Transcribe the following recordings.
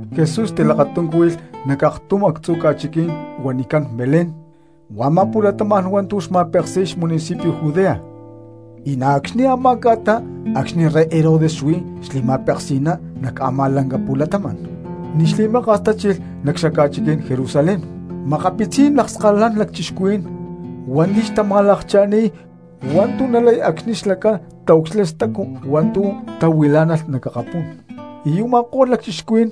Jesús tilakatuncúhuilh nac aktum actzu ca̠chiquí̠n huanicán Belén, huá a̠má pu̠latama̠n hua̠ntu̠ xma̠peksi̠y xamunicipio Judea, y na̠ acxni̠ a̠má ca̠ta acxni̠ rey Herodes xuí li̠ma̠peksi̠ná nac a̠má lanca pu̠latama̠n. Ni̠ xli̠maka̠s tachilh nac xaca̠chiquí̠n Jerusalén makapitzí̠n lakskalalán lacchixcuhuí̠n hua̠nti̠ xtama̠lakcha̠ni̠y hua̠ntu̠ nalay acxni̠ xlacán xtaucxilha stacu hua̠ntu̠ tahuilá̠nalh nac akapú̠n, y u̠ma̠ko̠lh lacchixcuhuí̠n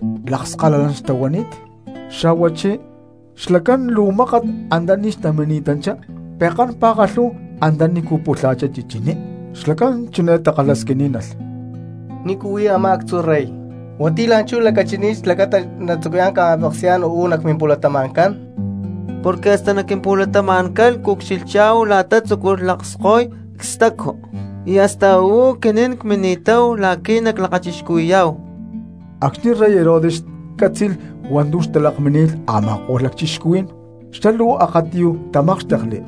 xca̠huanicán magos. Xa̠huachí xlacán luu mákat antaní xtamini̠tanchá pekán pa̠kalhú antanícu pulha̠chá chichiní. Xlacán chiné takalhasquiní̠nalh: —¿Nícu huí a̠má actzu rey hua̠nti̠ la̠nchú lacachini̠t xlacata xlá natzucuyá̠n ca̠ma̠peksi̠yá̠n uú nac mimpu̠latama̠ncán? Porque hasta nac quimpu̠latama̠ncán cucxilhchá̠hu la̠ta tzúculh lakskoy cstacu, y hasta uú aquinín cmini̠táhu la̠qui̠ naclakachixcuhui̠yá̠hu. Acxni̠ rey Herodes cátzi̠lh hua̠ntu̠ xtalakmini̠t a̠ma̠ko̠lh lacchixcuhuí̠n xlá luu akatiyuj tamákxtekli,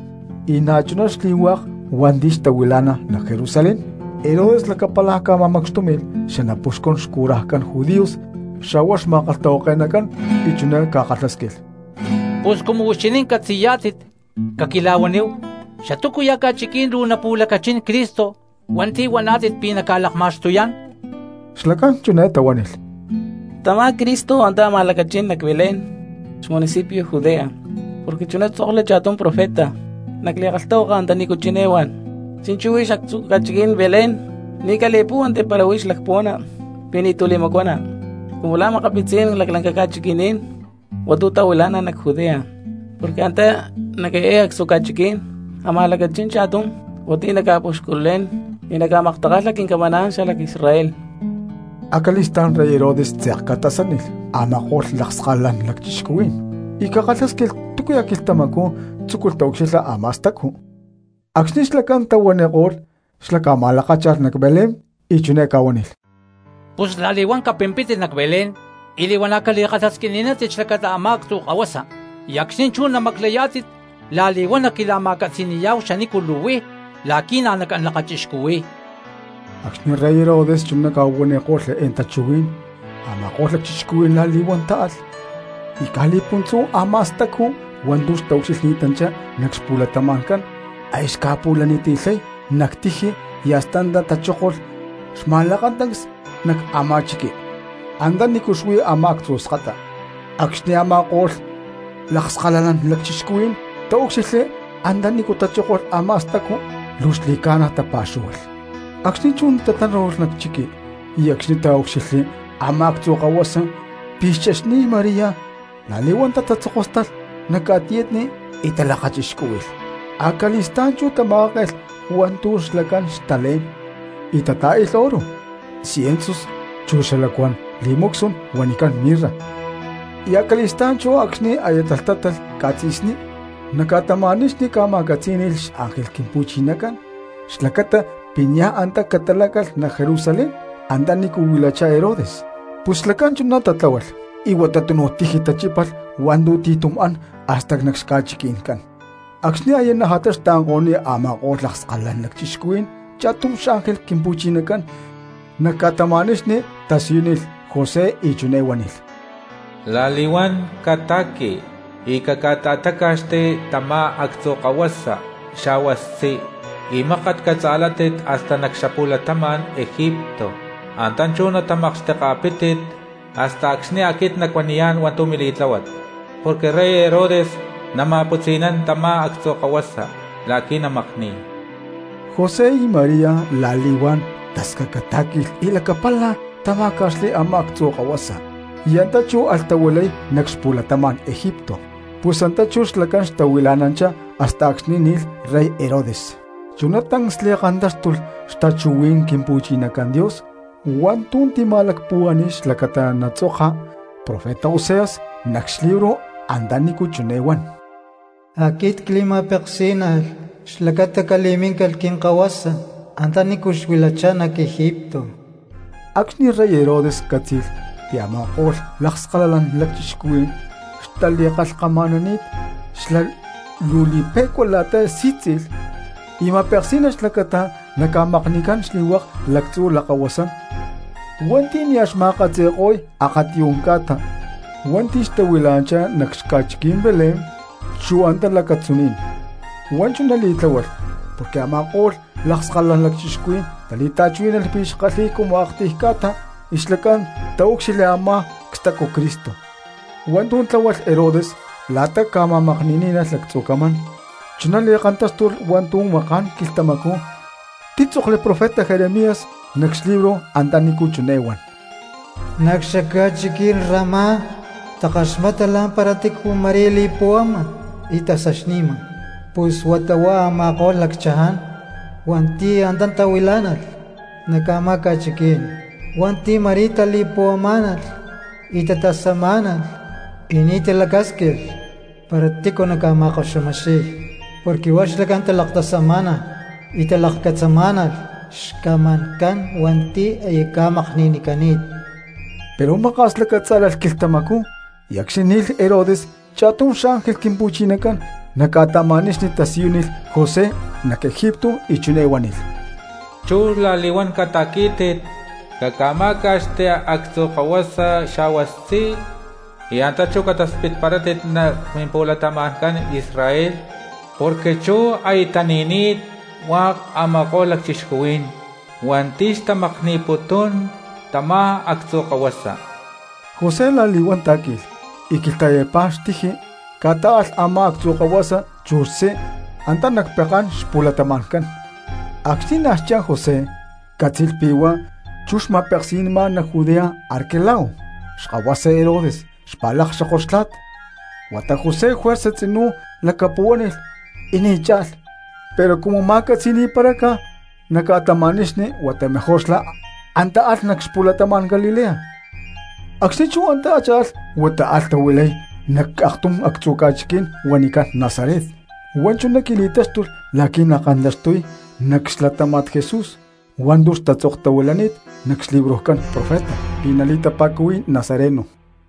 y na̠chuná xli̠lhu̠hua cristianos hua̠nti̠ xtahuilá̠nalh nac Jerusalén. Herodes lacapala ca̠ma̠macxtúmi̠lh xanapuxcun xcurajcán judíos xa̠huá xma̠kalhtahuake̠nacán, y chiné ca̠kalhásquilh: —Pus cumu huixinín catzi̠yá̠tit, caquila̠huaníhu, ¿xatúcuya̠ ca̠chiquí̠n luu napu̠lacachín Cristo hua̠nti̠ huaná̠tit pi̠ naca̠lakma̠xtuyá̠n? Xlacán chiné tahuánilh: —Tamá Cristo antá amaj lacachín nac Belén xmunicipio Judea, porque chuná títzokli cha̠tum profeta nac li̠kalhtahuaka antanícu chiné huán: Chi̠nchú huix actzu ca̠chiquí̠n Belén, ni̠ cali̠púhuanti para huix lacpuhuana pi̠ ni̠tu̠ li̠macuana cumu la̠ makapitzí̠n laclanca ca̠chiqui̠ní̠n hua̠ntu̠ tahuilá̠nalh nac Judea; porque antá nac eé actzu ca̠chiquí̠n amaj lacachín cha̠tum hua̠nti̠ naca̠puxculé̠n y naca̠maktakalha quincamaná̠n xalac Israel. Acali̠stá̠n rey Herodes tze̠k ca̠tasánilh a̠ma̠ko̠lh lakskalalán lacchixcuhuí̠n y ca̠kalhásquilh túcuya̠ quilhtamacú tzúculh taucxilha a̠má stacu. Acxni̠ xlacán tahuaniko̠lh xlá ca̠ma̠lakácha̠lh nac Belén, y chiné ca̠huánilh: —Pus la̠li̠huán capimpítit nac Belén y li̠huana̠ cali̠kalhasquini̠nántit xlacata a̠má actzu kahuasa; y acxni̠ chú namaclayá̠tit la̠li̠huán naquila̠ma̠catzi̠ni̠yá̠hu xanícu luu huí la̠qui̠ na̠ nacán lakachixcuhui̠y. Acxni̠ rey Herodes chuná ca̠huaniko̠lh eé tachuhuí̠n, a̠ma̠ko̠lh lacchixcuhuí̠n la̠li̠huán táalh. Y caj li̠puntzú a̠má stacu hua̠ntu̠ xtaucxilhni̠tanchá nac xpu̠latama̠ncán aya xca̠pu̠laniti̠lhay nac tiji y hasta antá tachókolh xma̠lakatancs nac amá chiqui antanícu xuí a̠má actzu skata. Acxni̠ a̠ma̠ko̠lh lakskalalán lacchixcuhuí̠n taúcxilhli antanícu tachókolh a̠má stacu, luu xli̠ca̠na tapa̠xúhualh. Acxni̠ chú tatánu̠lh nac chiqui y acxni̠ taúcxilhli a̠má actzu kahuasa pi̠ xchexni̠t María, la̠li̠huán tatatzokóstalh nac ca̠tiyatni y talakachixcúhui̠lh. Acali̠stá̠n chú tama̠káke̠lh xcajacán hua̠ntu̠ xpu̠maju̠ni̠t hua̠ntu̠ xlacán xtalé̠n y tatá̠i̠lh oro, siensus chu xalacuán perfumes huanicán mirra. Y acali̠stá̠n chú acxni̠ aya talhtátalh ca̠tzi̠sní, nac ca̠tama̠nixni ca̠ma̠catzí̠ni̠lh xángel Quimpu̠chinacán xlacata pi̠ niaj antá catáalh nac Jerusalén antanícu huilachá Herodes. Pus xlacán chuná tatláhualh y huata túnuj tiji tachípalh hua̠ntu̠ ti̠tum an hasta nac xca̠chiqui̠ncán. Acxni̠ aya najata xtaanko̠ni̠t a̠ma̠ko̠lh lakskalalán lacchixcuhuí̠n cha̠tum xángel Quimpu̠chinacán nac ca̠tama̠nixni tasiyúnilh José y chiné huánilh: —La̠li̠huán cata̠qui y caca̠ta̠táca̠xti tamá actzu kahuasa xa̠hua xtzí y mákat catza̠látit hasta nac xapu̠latama̠n Egipto. Antá chú natamakxteka̠pítit hasta acxni̠ aquit nacuaniyá̠n hua̠ntu̠ mili̠tláhuat, porque rey Herodes nama̠putzi̠nán tamá actzu kahuasa la̠qui̠ namakni̠y. José y María la̠li̠huán tascacatá̠qui̠lh y lacapala tamá̠ca̠xli a̠má actzu kahuasa y antá chú alh tahuilay nac xapu̠latama̠n Egipto. Pus antá chú xlacán xtahuila̠nanchá hasta acxni̠ ni̠lh rey Herodes. Chuná tancs li̠kantáxtulh xtachuhuí̠n Quimpu̠chinacán Dios hua̠ntu̠ tima̠lacpuhuá̠ni̠lh xlacata natzoka profeta Oseas nac xlibro antanícu chiné huán: “Aquit cli̠ma̠peksí̠nalh xlacata cali̠míncalh quinkahuasa antanícu xuilachá nac Egipto.” Acxni̠ rey Herodes cátzi̠lh pi̠ a̠ma̠ko̠lh lakskalalán lacchixcuhuí̠n xtali̠kalhkama̠nani̠t xlá luu li̠pe̠cua la̠ta sí̠tzi̠lh y ma̠peksí̠nalh xlacata naca̠makni̠cán xli̠hua̠k lactzu lakahuasán hua̠nti̠ nia̠ xma̠katzi̠ko̠y akatiyú̠n ca̠ta hua̠nti̠ xtahuilá̠nalh nac xaca̠chiquí̠n Belén chu antá lacatzuní̠n. Huá chuná li̠tláhualh porque a̠ma̠ko̠lh lakskalalán lacchixcuhuí̠n tali̠ta̠chuhuí̠nalh pi̠ xkalhi̠y cumu aktiy ca̠ta la̠ta xlacán titaúcxilhli a̠má cstacu Cristo. Hua̠ntu̠ tláhualh Herodes la̠ta ca̠ma̠makni̠ní̠nalh lactzu camán chuná li̠kantáxtulh hua̠ntu̠ maká̠n quilhtamacú títzokli profeta Jeremías nac xlibro antanícu chiné huán: Nac xaca̠chiquí̠n Ramá takaxmata la̠mpara tícu ma̠rí li̠puhuama y tasaxni̠ma. Pus huata huá a̠ma̠ko̠lh lacchaján hua̠nti̠ antá tahuilá̠nalh nac a̠má ca̠chiquí̠n hua̠nti̠ ma̠rí tali̠puhuamá̠nalh y tatasamá̠nalh, y ni̠ lacasquinko̠lh para tícu naca̠ma̠koxumixiy, porque huá xlacán talaktasamá̠nalh y talakcatzamá̠nalh xcamancán hua̠nti̠ aya ca̠makni̠nicani̠t. Pero maka̠s lacatzá̠lalh quilhtamacú y acxni̠ ni̠lh Herodes cha̠tum xángel Quimpu̠chinacán nac ca̠tama̠nixni tasiyúnilh José nac Egipto y chiné huánilh: —Chú la̠li̠huán cata̠quí̠tit caca̠má̠ca̠xti actzu kahuasa xa̠hua xtzí, y antá chú cataspitparátit nac mimpu̠latama̠ncán Israel, porque chú aya tani̠ni̠t hua̠k a̠ma̠ko̠lh lacchixcuhuí̠n hua̠nti̠ xtamakni̠putún tamá actzu kahuasa. José la̠li̠huán tá̠qui̠lh y quilhta̠yapá xtiji ca̠tá̠alh a̠má actzu kahuasa chu xtzí antá nac pekán xpu̠latama̠ncán. Acxni̠ nia̠ xcha̠n José cátzi̠lh pi̠ huá chú xma̠peksi̠nama nac Judea Arquelao xkahuasa Herodes xpa̠lakxoko xtla̠t. Huata José juerza tzinú lacapuhuánilh y ni̠ cha̠lh, pero cumu ma̠catzi̠ni̠paráca nac ca̠tama̠nixni huata mejor xlá antá alh nac xapu̠latama̠n Galilea. Acxni̠ chú antá cha̠lh huata alh tahuilay nac aktum actzu ca̠chiquí̠n huanicán Nazaret. Huá chuná qui̠li̠táxtulh la̠qui̠ nakantaxtuy nac xlatáma̠t Jesús hua̠ntu̠ xtatzoktahuilani̠t nac xlibrojcán profeta pi̠ nali̠tapa̠cuhui̠y nazareno.